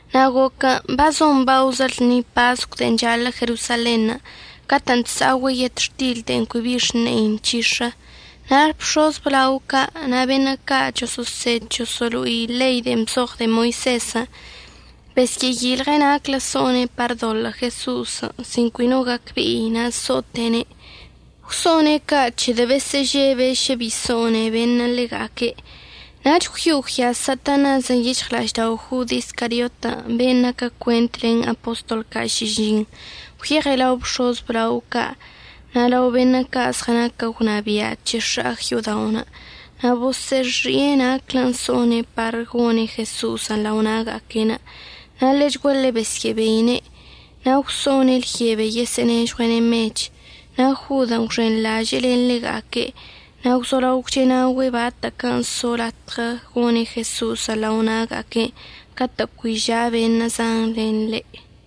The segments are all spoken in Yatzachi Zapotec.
Na' goquən' bazon baozə lṉi pascon' de'en chaḻə' Jerosalenṉə' catə'ən chsa'ogüe' yetxtil de'en cui bi xne'i nc̱hix̱ə. Na' bx̱oz əblao ca' na' beṉə' ca' choso'osed choso'olo'i ḻei de'en bzoɉ de'e Moisezən' besyə'əyilɉe' naclə so'one' par ədoḻə' Jeso'osən' sin cui no gacbe'i na' əso'ote'ene'. Gwso'one' ca' c̱hedə' besə'əžebe' šə bi so'one beṉə' ḻega'aque'. Nach gwyo'o gwyaz Satanasən' yic̱hɉla'aždao' Jod Iscariotən' ben' naquə cuent len apostol ca' šižiṉ. Gwyeɉe' lao bx̱oz əblao ca' na' lao beṉə' ca' zɉənaquə gwnabia' c̱he x̱a'ag yo'odaon' na' bosə'əxi'e naclə so'one' par gone' Jeso'osən' lao na'aga'aque'. Na' ḻechguaḻe besyə'əbeine', na' gwso'one' lyebe yosə'ənežɉue'ene' mech. Na' Jodən' gwxenḻaže'e len ḻega'aque' na' gwzolao gwche'enaogüe' batə'əquən' so latɉə gone' Jeso'osən' lao na'aga'aquen' catə' cui ža' beṉə' zan len ḻe'.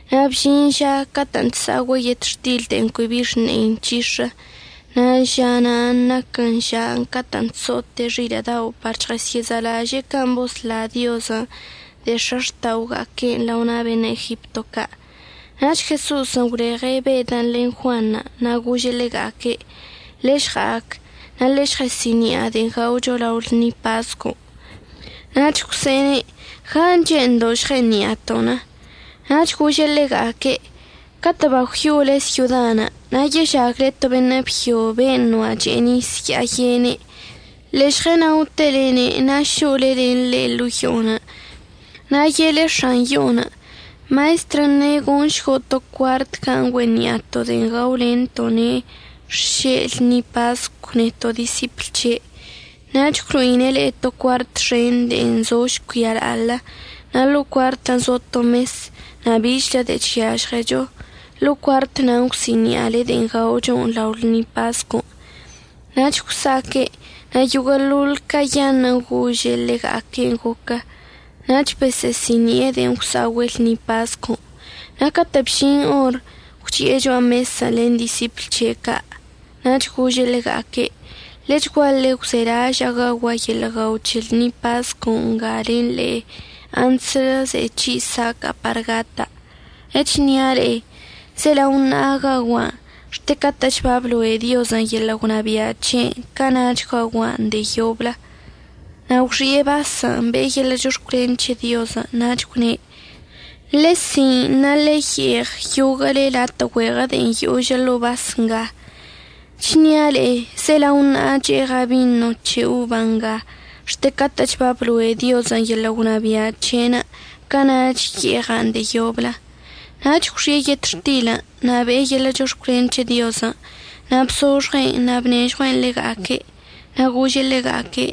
Na' bžin žan' catə'ən chsa'ogüe' yetxtil de'en cui bi xne'i nc̱hix̱ən. Na' ža na'anə' naquən žan' catə' chso'ote' xilə' dao' par chɉəsyə'əzalaže'e can' bosla Diozən' de'e x̱axta'oga'aque'enə' lao na' beṉə' Egipto ca'. Nach Jeso'osən' gwleɉe' Bedən' len Juanṉə' na' gože' ḻega'aque': ―Ḻe'e žɉa'ac na' ḻe'e žɉe'esi'ini'a de'en gaocho lao lṉi pascon'. Nach gwse'ene': ―¿Gan' che'endo' žɉe'eni'aton'? Nach gože' ḻega'aque': ―Catə' bagwyo'ole syodan' na' yežagle to beṉə' byo ben' noa' che'e nis ya'a yene'. Ḻe'e žɉənaotelene' na' šo'ole len ḻe' ḻo'o yo'onə'. Na' ye'ele x̱an yo'onə': “Maestrən' ne' goṉšgo' to cuart gan' güe'eni'ato' de'en gaolento'one' xše' lṉi pascon' neto' disipl c̱he'.” Nach əgwlo'ine' le'e to cuart xen de'en zo žcuia la'aḻə, na' ḻo'o cuartən' zo to mes na' bichlə de'e chyažɉecho. Ḻo'o cuart na'anə' əgwsi'ini'ale de'en gaocho lao lṉi pascon'. Nach gwsa'aque', na' yoguə'əḻoḻ cayaṉə'ənə' gože' ḻega'aque'enə' goquə. Nach bosə'əsi'ini'e de'en gwsa'ogüe' lṉi pascon'. Na' catə' bžin or, gwchi'e cho'a mesən' len disipl c̱he' ca'. Nach gože' ḻega'aque': ―Ḻechguaḻe gwzelaža'a gaogua' yeḻə' guao c̱he lṉi pascon' nga len le'e antslə ze'e c̱hi' saca'a par gata'. Chnia' le'e, zelao ṉa'a gaogua'an. Xte catə'əch babloe' Diozən' yeḻə' gwnabia' c̱he'enə', cana'ach gaogua'an de'e yoblə. Na' gwxi'e basən', be'e yeḻə' chox̱cwlen c̱he Diozən' nach gwne': ―Ḻe'e si'in na' ḻe'e ye'eɉ yoguə'əle latə' güeɉə de'en yožə ḻo'o bas nga. Chnia' le'e zelao ṉa'a che'eɉa' bino c̱he oban' nga. Xte catə'əch babloe' Diozən' yeḻə' gwnabia' c̱he'enə', cana'ach ye'eɉa'an de'e yoblə. Nach gwxi'e yetxtilən' na' be'e yeḻə' chox̱cwlen c̱he Diozən' na' bzoxɉe'en na' bnežɉue'en ḻega'aque'. Na' gože' ḻega'aque':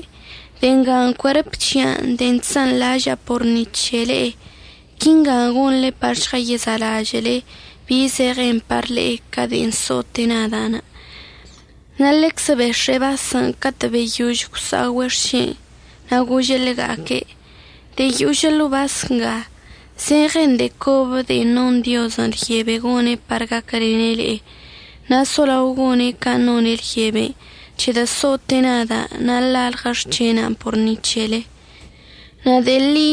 ―De'e ngan' cuerp c̱hia' de'en chsanḻaža'a por ni c̱he le'e. Quinga gonḻe par žɉəyezalažə'əle bi zeɉen par le'e ca de'en so'ote' nada'. Na' ḻeczə bex̱e'e basən' catə' babeyož gwsa'ogüe' xšen' na' gože' ḻega'aque': ―De'en yožə ḻo'o bas nga zeɉen de'e cobə de'en non Diozən' lyebe gone' par gaquəlene' le'e. Na' solao gone' can' none' lyeben' c̱hedə' so'ote' nada' na' lalɉə xc̱hena'anə' por ni c̱hele. Na' de'e ḻi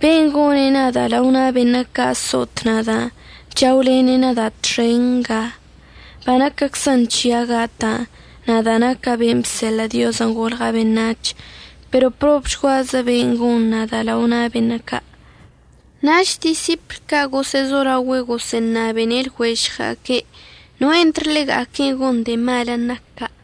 ben' gone' nada' lao na' beṉə' ca' so'ot nada' chaolene' nada' txen nga. Banaquəczən c̱hia' gata', nadan' naca' ben' bseḻə' Diozən' golɉa' beṉac̱h, pero ¡probchguazə be'enə' gon nada' lao na' beṉə' ca'! Nach disipl ca' gosə'əzolaogüe' gosə'əṉabene' lɉuežɉga'aque' noe' entr ḻega'aquen' gon de'e malən' nac ca'.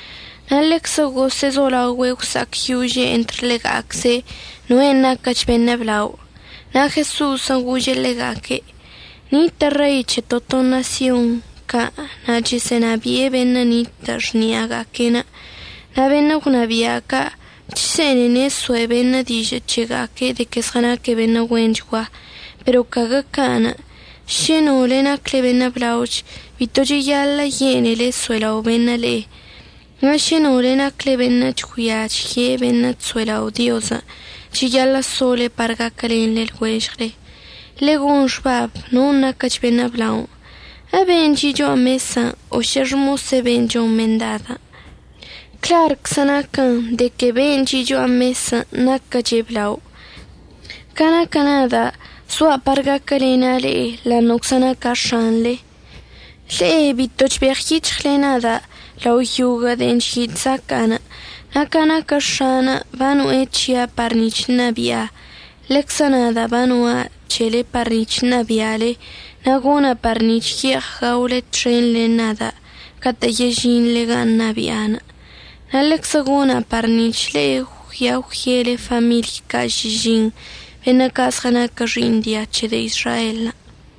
Na' ḻeczə gosə'əzolaogüe' gwsa'acyože' entr ḻega'acze' noen' naquəch beṉə' blao. Na' Jeso'osən' gože' ḻega'aque': ―Nitə' rei c̱he to to ṉasyon ca' na' chəsə'ənabi'e beṉə' nitə' xni'aga'aque'. Na' beṉə' gwnabia' ca' chse'enene' əsoe' beṉə' dižə' c̱hega'aque' de que zɉənaque' beṉə' güenchgua. Pero caguə can'. Šə no le'e nacle beṉə' blaoch, bito cheyaḻə' yene'ele əso'elao' beṉə' le'e. Na' šə no le'e nacle beṉə' chgüia chye beṉə' chso'elao' Diozən', cheyaḻə' sole par gaquəlen lɉuežɉle. Ḻe'e gon xbab non' naquəch beṉə' blao, ¿əbe'enə' chi' cho'a mesən', o šə xmose' ben' chon mendadən'? Clarczən' naquən de que ben' chi' cho'a mesən' naquəche' blao. Ca naquə nada' zoa' par gaquəlena' le'e ḻa'aṉə'əczə naca' X̱anḻe. Le'e bito chbeɉyic̱hɉle nada' lao yoguə'əḻoḻ de'en chyi' chzaca'a. Na' ca naquə X̱a'anə' bano'e c̱hia' par nic̱h ṉabi'a, ḻeczə nada' bano'a c̱hele par nic̱h ṉabi'ale. Na' gona' par nic̱h ye'eɉ gaole txen len nada' catə' yežinḻe gan' ṉabia'a. Na' ḻeczə gona' par nic̱h le'e əggüia əgwyele famiḻy ca' šižiṉ, beṉə' ca' zɉənaquə xi'iṉ dia c̱he de'e Izraelən'.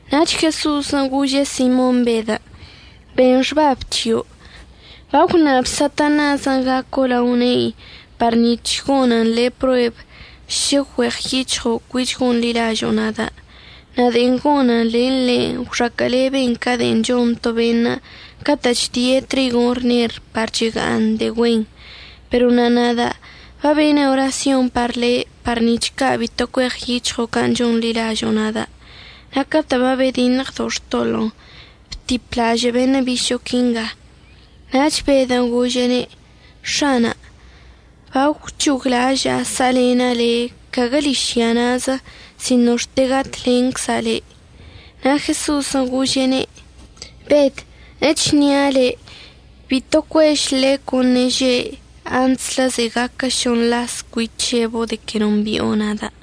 Nach Jeso'osən' gože' Simon Bedən': ―Ben xbab c̱hio', bagwṉab Satanasən' gaco' lao ne'in par nic̱h gonən le' prueb šə güeɉyic̱hɉo' cuich gonḻilažo'o nada'. Na' de'en gonən len le' gwxaquə'əleben ca de'en chon to beṉə' catə' chdie' trigon' rner par chega'aṉ de'e güen. Pero na' nada' babena' orasyon par le' par nic̱h ca' bito cueɉyic̱hɉo' can' chonḻilažo'o nada'. Na' catə' babediṉɉdo' xtoḻo'onə', btiplažə' beṉə' bišo'o quinga. Nach Bedən' gože'ene': ―X̱ana', bagwc̱hoglaža'a sa'alena' le' caguə ližya na'azə sino xte gatlencza' le'. Na' Jeso'osən' gože'ene': ―Bed, əchnia' le' bito cuež ḻecon' ṉeže' antslə ze'e gaquə šoṉ las cui chc̱hebo' de que nombi'o nada'.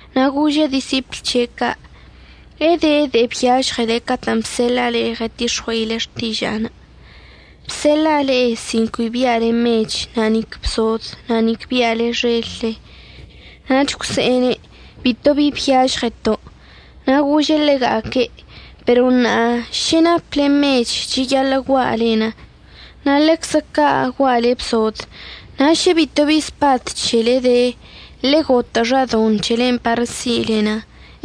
Na' gože' disipl c̱he' ca': ―¿Ede de'e byažɉele catə' bseḻa'a le'e ɉətix̱ɉue'ile xtiža'anə'? Bseḻa'a le'e sin cui bi'ale mech na' nic bsod, na' nic bi'ale xelle. Nach gwse'ene': ―Bitobi byažɉəto'. Na' gože' ḻega'aque': ―Pero ṉa'a ža šə naple mech cheyaḻə' gua'alen, na' ḻeczə ca' gua'ale bsod. Na' šə bito bi spad c̱helenə' de, ḻe'e gotə' xadoṉ c̱helen' par si'ilen.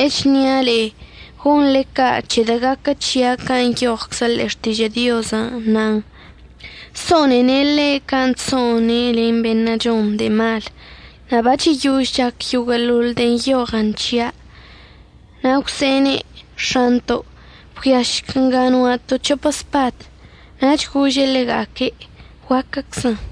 Echnia' le'e gonḻe ca' c̱hedə' gaquə c̱hia' can' nyoɉczən ḻe'e Xtižə' Diozən', nan: “So'onene' ḻe' can' chso'one' len beṉə' chon de'e mal.” Na' bacheyož chac yoguə'əḻoḻ de'en nyoɉən c̱hia'. Na' gwse'ene': ―X̱anto', bgüiašc nga no'ato' c̱hopə spad. Nach gože' ḻega'aque': ―Guaquəczən.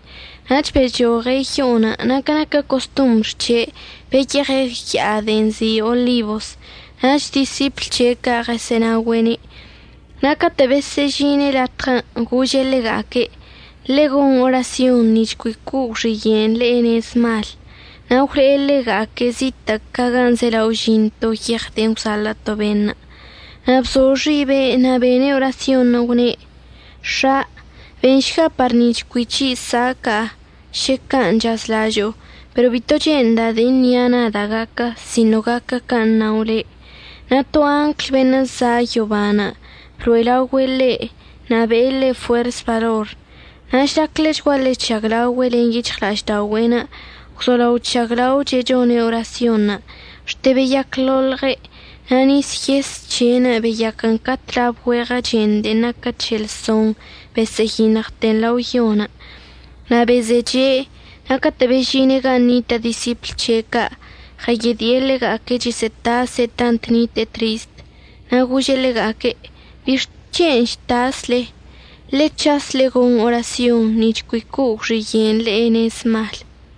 Nach bechoɉe' yo'onə' na' ca naquə costombr c̱he' beyeɉe' ya'a de'en nzi' Olibos nach disipl c̱he' ca' ɉəsə'ənaogüe'ene'. Na' catə' besyə'əžine' latɉən' gože' ḻega'aque': ―Ḻe'e gon orasyonṉə' nic̱h cui co'o gwxiye'enə' le'e nez mal. Na' gwle'e ḻega'aque' zitə' ca gan' zelao əžin to yeɉ de'e gwzaḻə' to beṉə', na' bzo xibe' na' bene' orasyonṉə'. Gwne': ―X̱a, benšga par nic̱h cui c̱hi' saca'a šə can' chazlažo'o, pero bito che'enda' de'e nia' nada' gaquə, sino gaquə can' əṉao le'. Na' to angl beṉə' za' yoban' blo'elaogüe' ḻe' na' be'e ḻe' fuers balor. Na' žlac ḻechguaḻe chžaglaogüe' len yic̱hɉla'aždaogüe'enə' gwzolao chžaglaoche' chone' orasyonṉə' xte beyacḻoḻɉe' na' nis yes c̱he'enə' beyaquən ca tlabə güeɉə chen de'en naquə c̱heḻsoṉ besə'əyiṉɉten lao yon'. Na' bezeche' na' catə' bežine' gan' nitə' disipl c̱he ca' ɉəyedi'e ḻega'aque' chəsə'ətase' tant nite'e trist. Na' gože' ḻega'aque': ―¿Bixc̱hen' chtasle? Ḻe'e c̱has, ḻe'e gon orasyon nic̱h cui co'o gwxiye'en le'e nez mal.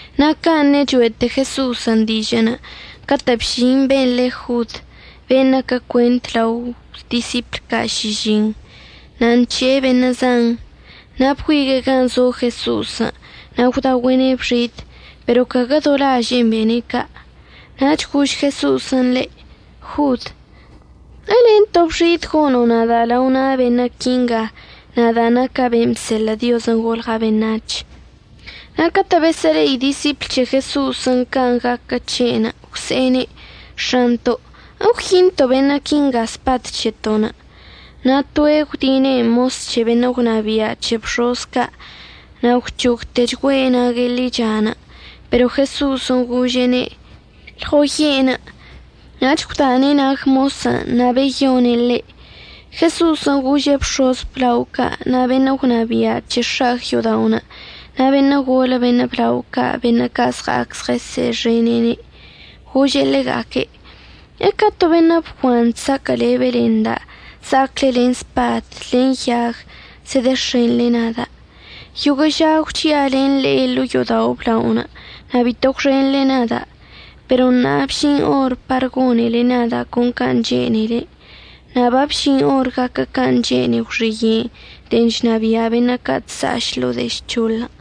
Na' ca ṉecho'ete Jeso'osən' dižə'ənə' catə' bžin ben' le Jod, ben' naquə cuent lao disipl ca' šižiṉ, na' nc̱he'e beṉə' zan. Na' bgüigue'e gan' zo Jeso'osən' na' gwdaogüe'ene' bx̱idən', pero caguə do laže'en bene' ca'. Nach gož Jeso'osən' ḻe': ―Jod, ¿əlen to bx̱id gono' nada' lao na' beṉə' quinga, nadan' naca' ben' bseḻə' Diozən' golɉa' beṉac̱h. Na' catə' besə'əle'i disipl c̱he Jeso'osən' can' gaquə c̱he'enə' gwse'ene': ―X̱anto', ¿əgwyinto' beṉə' quinga spad c̱heto'onə'? Na' toe' gwdinen' mos c̱he beṉə' gwnabia' c̱he bx̱oz ca', na' gwc̱hogtechgüe' nague' ḻichan'. Pero Jeso'osən' gože'ene': ―Lɉoye'enə'. Nach gwdane' nag mosən' na' beyone' ḻe'. Jeso'osən' gože' bx̱oz əblao ca' na' beṉə' gwnabia' c̱he x̱a'ag yo'odaonə', na' beṉə' golə beṉə' blao ca', beṉə' ca' zɉa'ac zɉəsə'əxene'ene', gože' ḻega'aque': ―¿Eca to beṉə' bguanṉə' chsaquə'əlebele nda' za'acle len spad len yag zedex̱enḻe nada'? Yoguə' ža gwchi'a len le'e ḻo'o yo'odao' əblaonə' na' bito gwxenḻe nada'. Pero ṉa'a babžin or par gonele nada' con can' chene'ele, na' babžin or gaquə can' chene'e gwxiye'enə' de'en chnabia' beṉə' ca' chsa'aš ḻo'o de'e žc̱hoḻən'.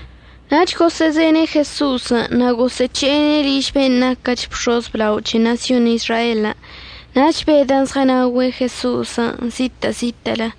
Nach gosə'əzene' Jeso'osən' na' gosə'əc̱he'ene' liž ben' naquəch bx̱oz əblao c̱he ṉasyon Izraelən'. Nach Bedən' zɉənaogüe' Jeso'osən' zitə' zitə'ələ.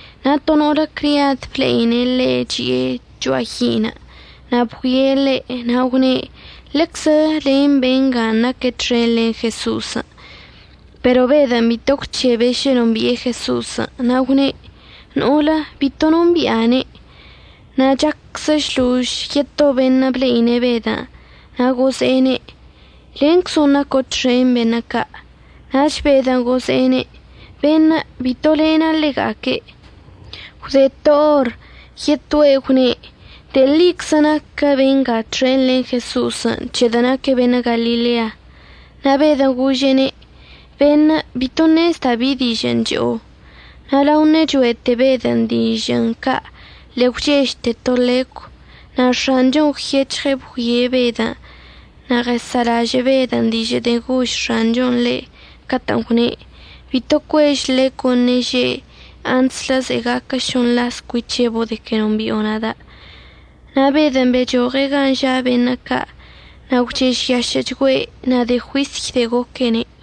Na' to no'olə criad ble'ine' ḻe' chi'e cho'a yi'inə', na' bgüie' ḻe' na' gwne': ―Ḻeczə len benga naque' txen len Jeso'osən'. Pero Bedən' bito gwc̱hebe' šə nombi'e Jeso'osən', na' gwne': ―No'olə, bito nombi'ane'. Na' chacczə šlož yeto beṉə' ble'ine' Bedən' na' gože'ene': ―Lenczon' naco' txen beṉə' ca'. Nach Bedən' gože'ene': ―Beṉə', bito lena' ḻega'aque'. Gwde to or yetoe' gwne': ―De'e ḻiczə naquə benga txen len Jeso'osən', c̱hedə' naque' beṉə' Galilea. Na' Bedən' gože'ene': ―Beṉə', bito ṉezda' bi dižə'ən cho'o. Na' lao ṉecho'ete Bedən' dižə'ən ca' ḻe'e gwchežte to ḻecw. Na' X̱anchon' gwyec̱hɉe' bgüie' Bedən', na' ɉəsa'alažə' Bedən' dižə' de'en gož X̱anchon' ḻe' catə'ən gwne': “Bito cuež ḻecon' ṉeže' antslə ze'e gaquə šoṉ las cui c̱hebo' de que nombi'o nada'.” Na' Bedən' bechoɉe' gan' ža' beṉə' ca' na' gwchežyašə'əchgüe'. Na' de'e juisy de'e goquene'.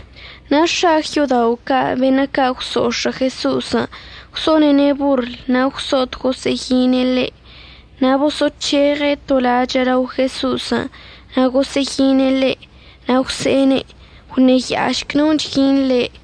Na' x̱a'ag yo'odao' ca' beṉə' ca' gwso'ox̱ə' Jeso'osən' gwso'onene' borl na' gwso'ot gosə'əyine' ḻe'. Na' boso'oc̱heɉe' to lachə' lao Jeso'osən' na' gosə'əyine' ḻe'. Na' gwse'ene': ―Gwṉeya'ašc ¿non' chyin le'?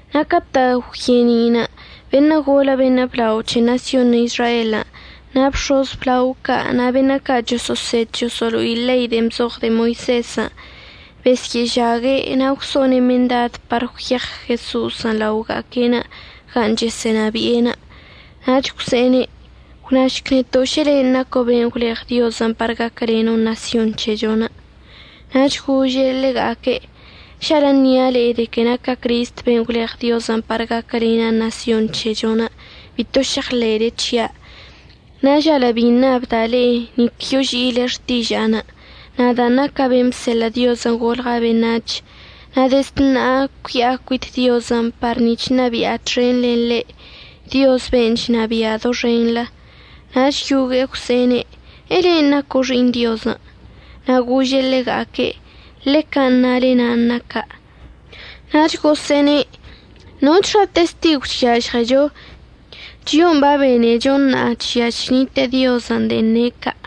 Na' catə' gwye'eni'inə' beṉə' golə beṉə' blao c̱he ṉasyon Izraelən' na' bx̱oz əblao ca' na' beṉə' ca' choso'osed choso'olo'i ḻei de'en bzoɉ de'e Moisezən' besyə'əžague' na' gwso'one' mendad par gwyeɉ Jeso'osən' laoga'aque'enə' gan' chəsə'ənabi'enə'. Nach gwse'ene': ―Gwnašc neto' šə len' naco' ben' gwleɉ Diozən' par gaquəleno' ṉasyon c̱hechon'. Nach gože' ḻega'aque': ―Žalə' ṉia' de que naca' Cristən' ben' gwleɉ Diozən' par gaquəlena' ṉasyon c̱hechon' bito šeɉḻe'ele c̱hia'. Na' žalə' bi ṉabda' le'e nic yoži'ile xtiža'anə'. Nadan' naca' ben' bseḻə' Diozən' golɉa' beṉac̱h, na' dezd ṉa'a cui'a cuit Diozən' par nic̱h ṉabi'a txen len ḻe', Dioz ben' chnabia' doxenḻə. Nach yogue'e gwse'ene': ―¿Elen' naco' Xi'iṉ Diozən'? Na' gože' ḻega'aque': ―Ḻe can' nale nan' naca'. Nach gosə'əne': ―¿Nochxa testigw chyažɉecho? Chio'on babenecho ṉa'a chžia chnite'e Diozən' de'en ne' ca'.